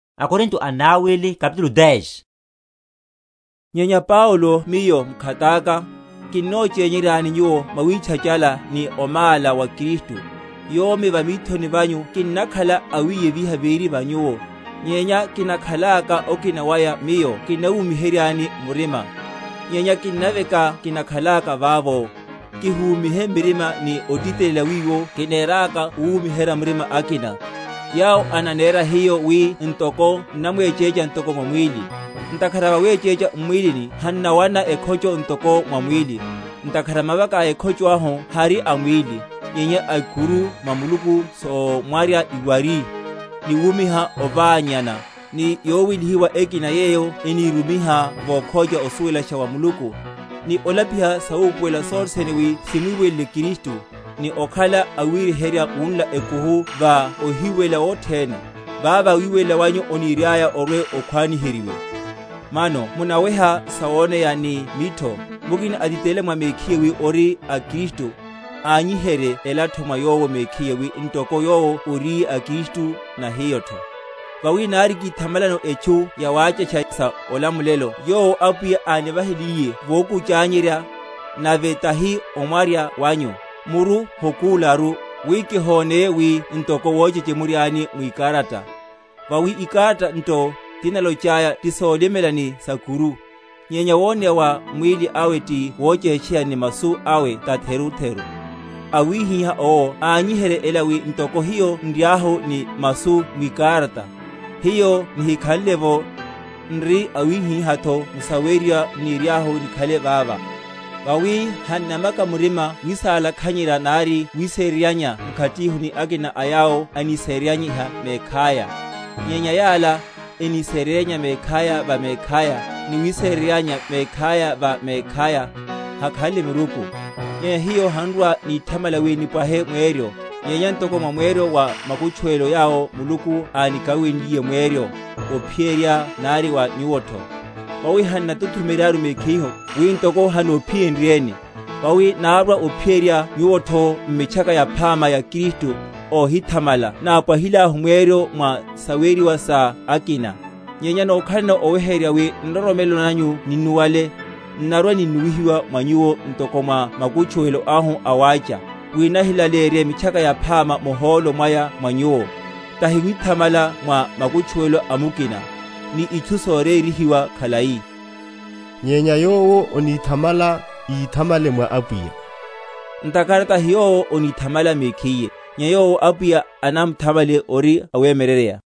Olamulelo awe wa Paulo. Nyenya Paulo miyo mkhataka, kinnochényeryani nyuwo mwawítchachala ni omála wa Kristu, yomi va mithoni vanyu kinnakhala awiyeviha véri va nyuwo, nyenya kinakhalaka okina waya miyo kinnawumiheryani murima; nyenya kinnaveka kinakhalaka vavo, kihumihe murima ni otitelela wiwo kineraka owumiherya murima akina, yawo ananera hiyo wi ntoko n’namwechécha ntoko mwa mwíli. Ntakhara vawechécha m’mwílini hannawana ekhocho ntoko mwa mwíli, (ntakhara mavaka a ekhocho ahu hari a mwíli, nyenya a ikuru mwa Muluku somwarya iwari); ni wuwiha oványana, ni yowelihiwa ekina yeyo enírumiha vokhócha osuwelasha wa Muluku, ni olapiha sawupuwelela sothene wi simwiwelele Kristu; ni okhala awiryeherya wunla ekuhu va ohiwelela wothene, vavá wiwelela wanyu oniriaya orwe‐okhwaniheryiwe. Mano munaweha sawoneya ni mitho? Mukina atitelela mwa mekhiye wi ori a Kristu, ányiherye elatho mwa yowo mekhiye, wi ntoko yowo oriye a Kristu, na hiyotho. Vawi nari kithamalano etchu yawáchasha sa olamulelo (yowo Apwiya ánivahiliye votchukanyerya, nave tahi omwarya wanyu), muru hokúlaru; wi kihoneye wi ntoko wochechemuryani mwikarata. Vawi, ikarata nto, tinalochaya, ti solimela, ni sa’kuru; nyenya woneya wa mwíli awe ti wochétcheya, ni masu awe tatheru‐theru. Awihiha owo ányiherye ela wi ntoko hiyo nriahu ni masu mwikarata, hiyo nihikhanle’vo, ni awihihatho m’saweriwa n’niriahu nikhale vavá. Vawi hannamaka murima wisalakhanyerya, nari wisereryanya mkhatihu ni akina a yawo anisemyeryeryiha mekhaya; nyenya yala, eniseryaya mekhaya va mekhaya, ni wisereryanya mekhaya va mekhaya, hakhanle miruku. Nyenya hiyo han’rwa‐nithamala wi nipwahe mweryo, nyenya ntoko mwa mweryo wa makutchuwelo yawo Muluku ánikawenliye mweryo, ophiyerya nari wa nyuwotho. Vawi han’natuthumeryaru mekhihu, wi ntoko hanophiyenryeni; vawi nárwa ophiyerya nyuwotho, m’Mitchaka Yaphama ya Kristu: óhíthamala nápwahilahu mweryo mwa saweriwa sa akina; nyenya nokhalano oweheryerya wi nroromelo nanyu ninnuwale, n’narwaninnuwihiwa mwa nyuwo ntoko mwa makutchuwelo ahu a wácha, wi nahilaleyerye Mitchaka Yaphama muhólo mwaya mwa nyuwo, tahi withamala mwa makutchuwelo a mukina, ni itchu soryeheryiwa khalai. Nyenya yowo onithamala íthamale mwa Apwiya; Ntakhara tahi yowo onithamala mekhiye, nyenya vowo Apwiya anamthamalaye ori awemyeryeryeya.